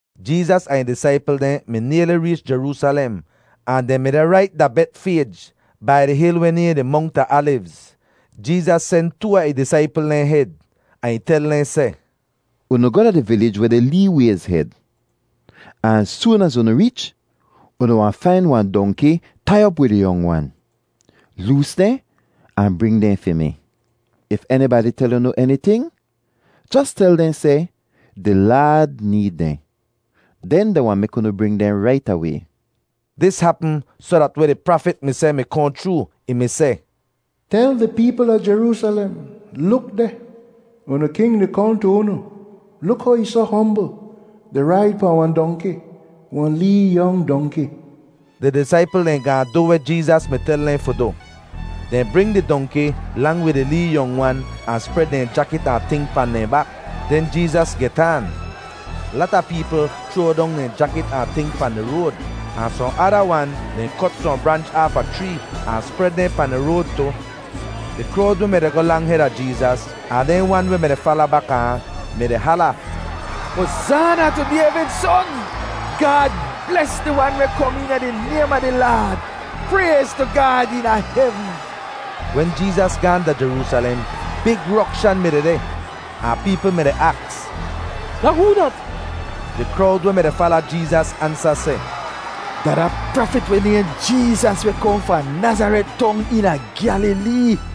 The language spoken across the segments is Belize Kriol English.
Jeezas ahn ih disaipl dehn mi nayli reech Jeroosalem, ahn dehn mi deh rait da Betfayj, bai di hil weh nayhn di Mongt a Alivz. Jeezas sen too a ih disaipl dehn hed, ahn ih tel dehn seh, “Unu goh da di vilij weh deh lee wayz hed, ahn az soon az unu reech, unu wahn fain wahn dongki tai op wid ih yong wan; loos dehn, ahn bring dehn fi mi. If enibadi tel unu eniting, jos tel dehn seh, ‘Di Laad need dehn.’ Den dehn wahn mek unu bring dehn rait away.” Dis hapm soh dat weh di prafit mi seh mi kohn chroo. Ih mi seh, “Tel di peepl a Jeroosalem: ‘Luk deh! Unu king di kohn tu unu. Luk how ih soh hombl, di raid pahn wahn dongki, wahn lee yong dongki.’” Di disaipl dehn gaahn du weh Jeezas mi tel dehn fi du. Dehn bring di dongki lang wid ih lee yong wan ahn spred dehn jakit ahn ting pahn dehn bak. Den Jeezas get aan. Lata peepl chroa dong dehn jakit ahn ting pahn di road, ahn sohn ada wan dehn kot sohn branch aafa chree ahn spred dehn pahn di road tu. Di krowd weh mi-di goh lang heda Jeezas ahn dehn wan weh mi-di fala baka ahn mi-di hala, “Hozaana tu Dayvid Son! Gaad bles di Wan weh kom eena di naym a di Laad! Prayz tu Gaad eena hevn!” Wen Jeezas gaahn da Jeroosalem, big rokshan mi dehdeh ahn peepl mi-di aks, “Da hoo dat?” Di krowd weh mi-di fala Jeezas ansa seh, “Da da prafit weh nayhn Jeezas weh kohn fahn Nazaret Tong eena Gyalilee.”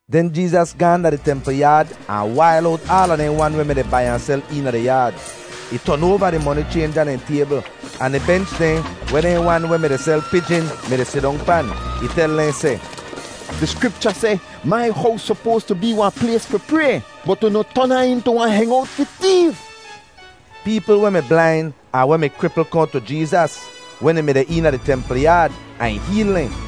Den Jeezas gaahn da di templ yaad ahn wail owt aala dehn wan weh mi-di bai ahn sel eena di yaad. Ih ton oava di moni chaynja dehn taybl ahn di bench dehn weh dehn wan weh mi-di sel pijin mi-di sidong pan. Ih tel dehn seh, “Di Skripcha seh, ‘Mai hows sopoas tu bee wahn plays fi pray,’ bot unu ton ahn intu ‘wahn hengowt fi teef.’” Peepl weh mi blain ahn weh mi kripl kohn tu Jeezas wen ih mi deh eena di templ yaad, ahn ih heel dehn.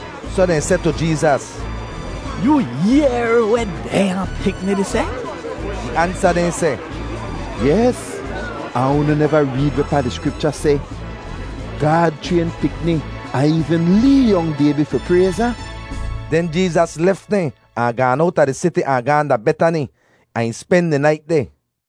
Soh dehn seh tu Jeezas, “Yoo yehr weh dehnya pikni di seh?” Ih ansa dehn seh, “Yes, ahn unu neva reed wehpaa di Skripcha seh, ‘Gaad chrayn pikni ahn eevn lee yong baybi fi prayz ahn?’” Den Jeezas lef dehn ahn gaan owta di siti ahn gaahn da Betani, ahn ih spen di nait deh.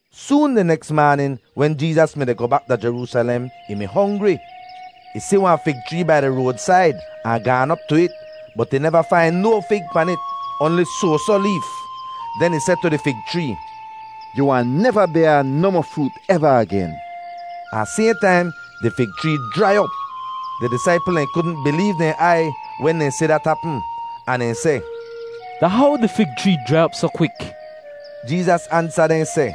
Soon di neks maanin wen Jeezas mi-di goh bak da Jeroosalem, ih mi hongri. Ih si wahn fig chree bai di roadsaid ahn gaan op tu it bot ih neva fain no fig pan it, oanli soasoh leef. Den ih seh tu di fig chree, “Yu wahn neva bayr nohmoh froot eva agen!” Ahn sayhn taim di fig chree jrai op. Di disaipl dehn kudn bileev dehn aiy wen dehn si dat hapm, ahn dehn seh, “Da how di fig chree jrai op soh kwik?” Jeezas ansa dehn seh,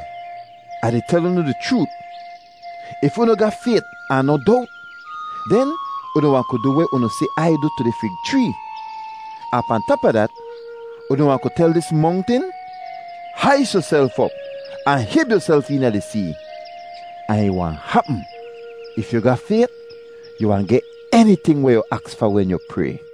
“Ah di tel unu di chroot, if unu ga fayt ahn noh dowt, den unu wahn ku du weh unu si Ai du tu di fig chree. Ahn pahn tap a dat, unu wahn ku tel dis mongtin, ‘Hais yuself op ahn hib yuself eena di see,’ ahn ih wahn hapm. If yu ga fayt, yu wahn geh eniting weh yu aks fa wen yu pray.”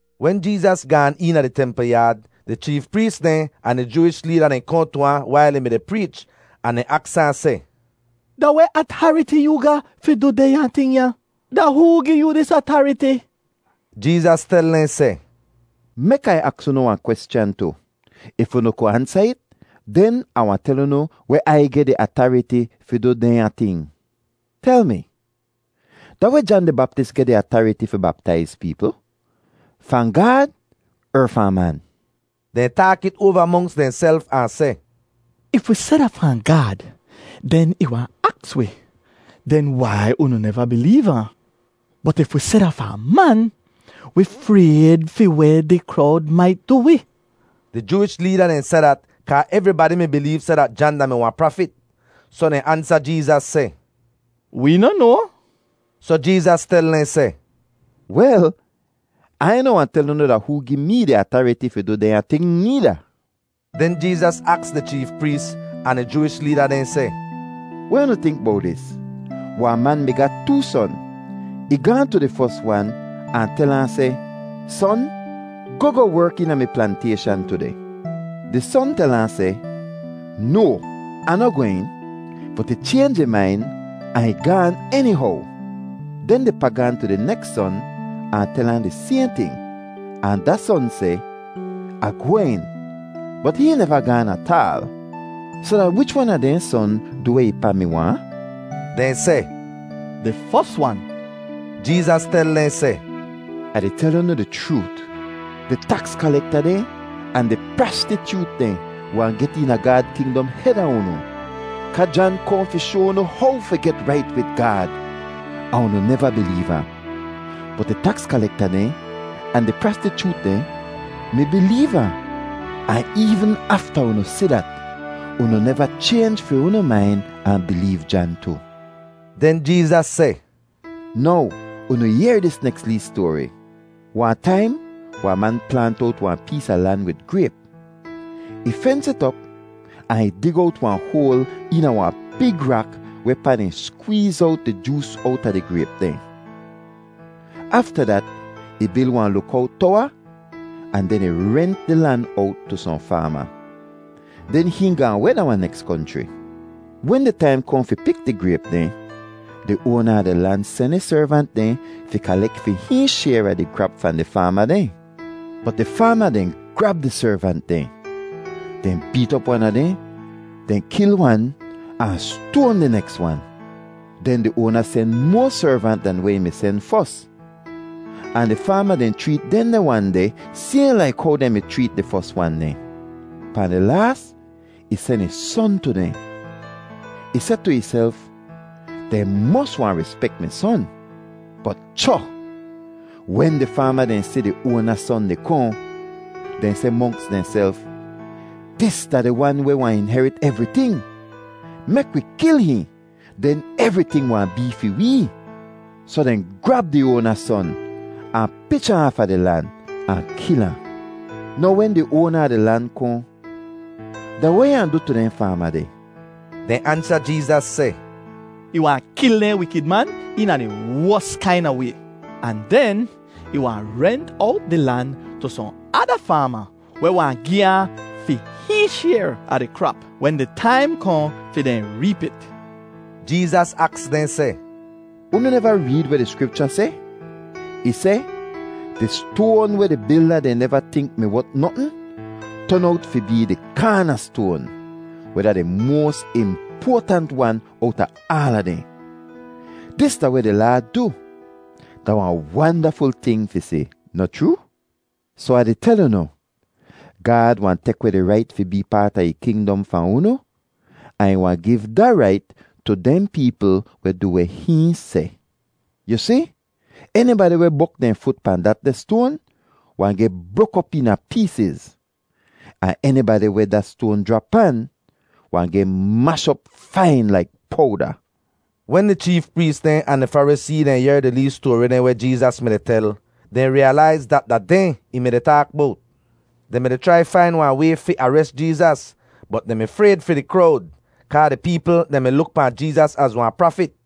Wen Jeezas gaan eena di templ yaad, di cheef prees dehn ahn di Jooish leeda dehn kohn tu ahn wail ih mi-di preech ahn dehn aks ahn seh, “Da weh atariti yoo ga fi du dehnya ting ya? Da hoo gi yoo dis atariti?” Jeezas tel dehn seh, “Mek Ai aks unu wahn kweschan tu. If unu ku ansa it, den Ah wahn tel unu weh Ai geh di atariti fi du dehnya ting. Tel mi, da weh Jan di Baptis geh di atariti fi baptaiz peepl—fahn Gaad er fahn man?” Dehn taak it oava monks dehnself ahn seh, “If wi seh da fahn Gaad, den ih wahn aks wi, ‘Den wai unu neva bileev ahn?’ Bot if wi seh da fahn man, wi frayd fi weh di krowd mait du wi.” Di Jooish leeda dehn seh dat kaa evribadi mi bileev seh dat Jan da-mi wahn prafit. Soh dehn ansa Jeezas seh, “Wee noh noa.” Soh Jeezas tel dehn seh, “Wel, Ai noh wahn tel unu da hoo gi mee di atariti fi du dehnya ting needa.” Den Jeezas aks di cheef prees ahn di Jooish leeda dehn seh, “Weh unu tink bowt dis? Wahn man mi ga too son. Ih gaahn tu di fos wan ahn tel ahn seh, ‘Son, goh goh werk eena mi plantayshan tudeh.’ “Di son tel ahn seh, ‘No, Ah noh gwehn.’ Bot ih chaynj ih main ahn ih gaan enihow. “Den di pa gaahn tu di neks son ahn tel ahn di sayhn ting, ahn da son seh, ‘Ah gwehn,’ bot hihn neva gaan ataal. “Soh da wich wan a dehn son du weh ih pa mi waahn?” Dehn seh, “Di fos wan.” Jeezas tel dehn seh, “Ah di tel unu di chroot, di taks kalekta dehn ahn di prastichoot dehn wahn get eena Gaad kingdom heda unu! Kaa Jan kohn fi shoa unu how fi get rait wid Gaad ahn unu neva bileev ahn. Bot di taks kalekta dehn ahn di prastichoot dehn mi bileev ahn, ahn eevn afta unu si dat, unu neva chaynj fi unu main ahn bileev Jan tu.” Den Jeezas seh, “Now unu yehr dis neks lee stoari: Wahn taim wahn man plaant owt wahn pees a lan wid grayp. Ih fens it op ahn ih dig owt wahn hoal eena wahn big rak wehpaa dehn skweez owt di joos owta di grayp dehn. Afta dat ih bil wahn lukowt towa ahn den ih rent di lan owt tu sohn faama. Den hihn gaahn weh da wahn neks konchri. Wen di taim kohn fi pik di grayp dehn, di oana a di lan sen ih servant dehn fi kalek fi hihn shayr a di krap fahn di faama dehn. “Bot di faama dehn grab di servant dehn. Dehn beet op wan a dehn, dehn kil wan, ahn stoan di neks wan. Den di oana sen moa servant dan weh ih mi sen fos, ahn di faama dehn chreet dehndeh wan deh sayhn laik how dehn mi chreet di fos wan dehn. Pahn di laas ih sen ih son tu dehn. Ih seh tu ihself, ‘Dehn mos wahn rispek mi son.’ “Bot cho! Wen di faama dehn si di oana son di kohn, dehn seh monks dehnself, ‘Dis da di wan weh wahn inherit evriting. Mek wi kil hihn, den evriting wahn bee fi wee.’ Soh dehn grab di oana son ahn pich ahn aafa di lan ahn kil ahn. “Now wen di oana a di lan kohn, da weh ih wahn du tu dehn faama deh?” Dehn ansa Jeezas seh, “Ih wahn kil dehn wikid man eena di wos kaina way ahn den ih wahn rent owt di lan tu sohn ada faama weh wahn gi ahn fi hihn shayr a di krap wen di taim kohn fi dehn reep it.” Jeezas aks dehn seh, “Unu neva reed weh di Skripcha seh? Ih seh, ‘Di stoan weh di bilda dehn neva tink mi wot notn ton owt fi bee di kaanastoan, weh da di moas impoatant wan owta aala dehn. Dis da weh di Laad du. Da wahn wandaful ting fi si, noh chroo’? “Soh Ah di tel unu, Gaad wahn tek weh di rait fi bee paat a ih kingdom fahn unu, ahn ih wahn giv da rait tu dehn peepl weh du weh hihn seh. [Yu si, enibadi weh bok dehn fut pahn datdeh stoan wahn geh brok op eena peesiz; ahn enibadi weh da stoan jrap pan wahn geh mash op fain laik powda.”] Wen di cheef prees dehn ahn di Farisee dehn yehr di lee stoari dehn weh Jeezas mi-di tel, dehn riyalaiz dat da dehn ih mi-di taak bowt. Dehn mi-di chrai fain wahn way fi ares Jeezas, bot dehn mi frayd fi di krowd kaa di peepl dehn mi luk pahn Jeezas az wahn prafit.